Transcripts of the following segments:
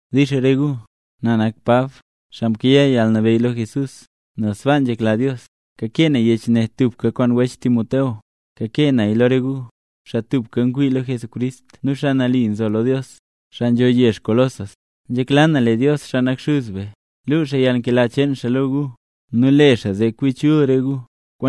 Dix re gu. Na nak Pab, xaa mkayaa yalnabeyy lo Jesús, nel sbaa nzhekla Dios. Kakee na yech ne tubka kwaan wech Timoteo. Kakee naya lo re gu, xaa tubka ngwii lo Jesucrist, xaa mle nambey gu, xaa nzho yezh Colosas. Nzhekla na lee Dios, xaa nak Xuz be, luu yalnkela cheen xaa lo gu nu le xaa zee kwi chul re gu.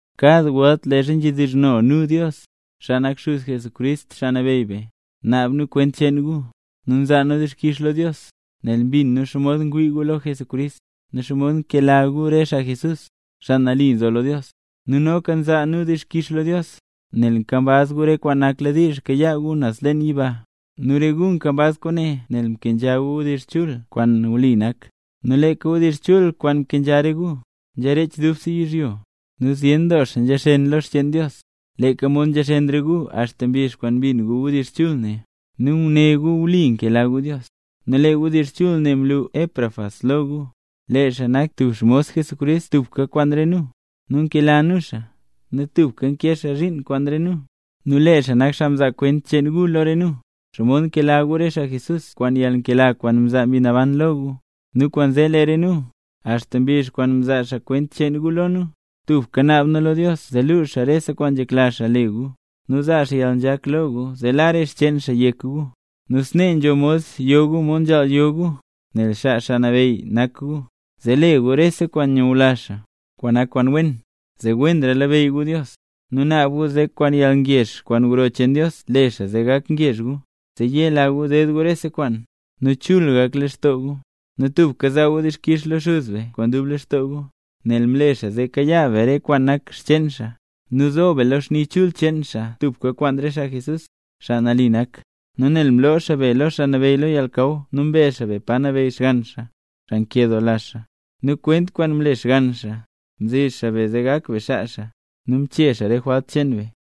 Kad welt leezha nzhedizhno nu Dios, xaa nak Xuz Jesucrist Xaa Nabeyy be, naab nu kwent cheen gu. Nu nzaa nu dixkix lo Dios, nel mbin nu xomod ngwii gu lo Jesucrist, nu xomod nkela gu re xaa Jesús, xaa nambey. Nu noka nzaa nu dixkix lo Dios, nel nkambaz gu re kwaan nakladiizh kayaa gu naz leen yiba. Nu re gu nkambaz kwaane nel mkenzha gu wdizh chul kwaan wli nak. Nu leeka wdizh chul kwaan mkenzha re gu, nzharech dubse yizhyo, nu zyen doo xaa nzhaxen lo xcheen Dios, leeka mod nzhaxen re gu axta mbizh kwaan mbin gu wdizh chul ne, nu ngune gu wli nkela Dios gu. Nu lee wdizh chul ne mlu Epafras lo gu. Lee xaa nak tub xmos Jesucrist tubka kwaan re nu, nu nkela nu xaa, nu tubka nkee xaa zhiin kwaan re nu. Nu lee xaa nak xaa mzaa kwent cheen gu lo re nu, xomod nkela gu re xaa Jesús kwaan yalnkela kwaan mzaa Mbi Naban lo gu. Nu kwaanzee lee re nu, axta mbizh kwaan mzaa xaa kwent cheen gu lo nu, tubka naab nu lo Dios zee luu xaa rese kwaan nzhekla xaa le gu, nu zaa xaa yalnzhak lo gu zee la re xcheen xaa yek gu. Nu snee nzho mod yo gu mod nzhaal yo gu, nel xaa Xaa Nabeyy nak gu, zee le gu rese kwaan nyula xaa, kwaan nak kwaan wen, zee wenra labeyy gu Dios. Nu naab nu zee kwaan yalngezh kwaan gro cheen Dios le xaa zee gak ngezh gu, zee yela gu ded gu rese kwaan, nu chul gak lextoo gu, nu tubka zaa gu dixkix lo Xuz be kwaan dub lextoo gu, nel mle xaa zee kayaa be re kwaan nak xcheen xaa, nu zo be lo xni chul cheen xaa tubka kwaan re xaa Jesús, xaa nambey nak, nu nel mloo xaa be lo xaa nabeyy lo yalnakaw nu mbe xaa be pa nabeyy Xgann xaa, xaa nkedoola xaa. Nu kwent cheen kwaan mle Xgann xaa, mzi xaa be zee gak be xaa xaa, nu mchee xaa re jwalt cheen be.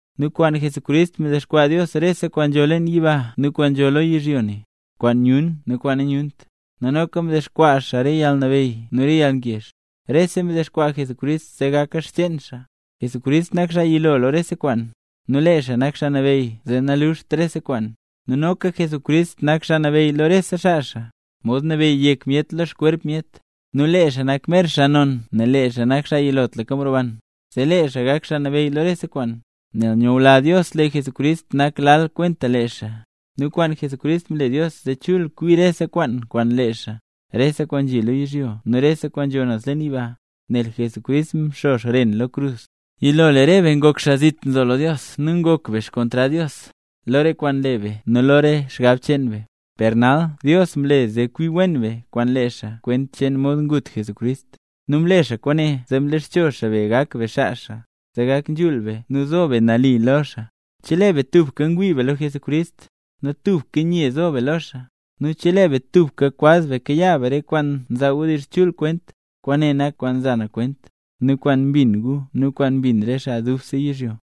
Nu kwaan Jesucrist mdexkwaa Dios rese kwaan nzho leen yiba nu kwaan nzho lo yizhyo ne, kwaan nyun nu kwaan nanyunt, nu noka mdexkwaa xaa re yalnabeyy nu re yalngezh. Rese mdexkwaa Jesucrist zee gaka xcheen xaa. Jesucrist nak xaa yilo lo rese kwaan, nu lee xaa nak xaa nabeyy zee naluuxt rese kwaan. Nu noka Jesucrist nak Xaa Nabeyy lo rese xaa xaa, mod nabeyy yek myet lo xkwerp myet. Nu lee xaa nak mer xaa non nel lee xaa nak xaa yilotlaka mroban, zee lee xaa gak Xaa Nabeyy lo rese kwaan. Nel nyula Dios lee Jesucrist nak lal kwenta lee xaa, nu kwaan Jesucrist mle Dios zee chul kwi rese kwaan kwaan lee xaa, rese kwaan nzhi lo yizhyo nu rese kwaan nzho naz leen yiba, nel Jesucrist mxo xren lo krus. Yilo lee re be ngok xaa zit nzo lo Dios nu ngok be xkontrad Dios, lo re kwaan nle be nu lo re xgab cheen be, per nal Dios mle zee kwi wen be kwaan lee xaa kwent cheen mod ngut Jesucrist. Nu mle xaa kwaane zee mlexcho xaa be gak be xaa xaa, zee gak nzhul be, nu nambey be, nu zo be nali lo xaa, chelee be tubka ngwii be lo Jesucrist, nu tubka nye zo be lo xaa, nu chelee be tubka kwaz be kayaa be re kwaan nzaa wdizh chul kwent. Kwaane nak kwaan nza na kwent, nu kwaan mbin gu nu kwaan mbin re xaa dubse yizhyo.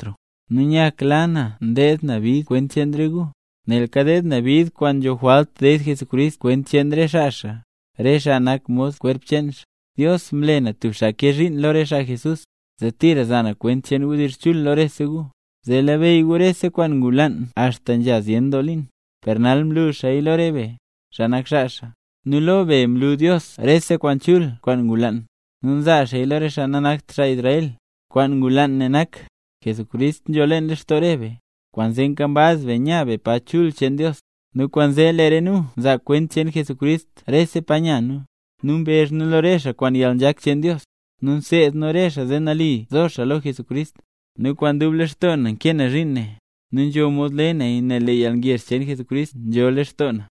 Nu nyakla na ndeed na bid kwent cheen re gu, nel kadeed na bid kwaan nzho jwalt ded Jesucrist kwent cheen re xaa xaa, re xaa nak mod kwerp cheen xaa. Dios mle na tub xaa kee zhiin lo re xaa Jesús, zee tira za na kwent cheen wdizh chul lo rese gu, zee labeyy gu rese kwaan ngulaan axta nzha zyen doo liin, per nal mlu xaaya lo rese be, xaa mle Jesús nambey. Nu lo be mlu Dios rese kwaan chul kwaan ngulaan, nu nzaa xaaya lo re xaa nanakt xaa Israel. Kwaan ngulaan ne nak: Jesucrist nzho leen lextoo re be, kwaanzee nkambaz be nya be pa chul cheen Dios. Nu kwaanzee lee re nu nzaa kwent cheen Jesucrist rese pa nya nu, nu mbezh nu lo re xaa kwaan re yalnzhak cheen Dios, nu nseed nu re xaa zee nali zo xaa lo Jesucrist. Nu kwaan dub lextoo na nkee na zhiin ne, nu nzho mod le naya nel lee yalngezh cheen Jesucrist nzho leen lextoo na.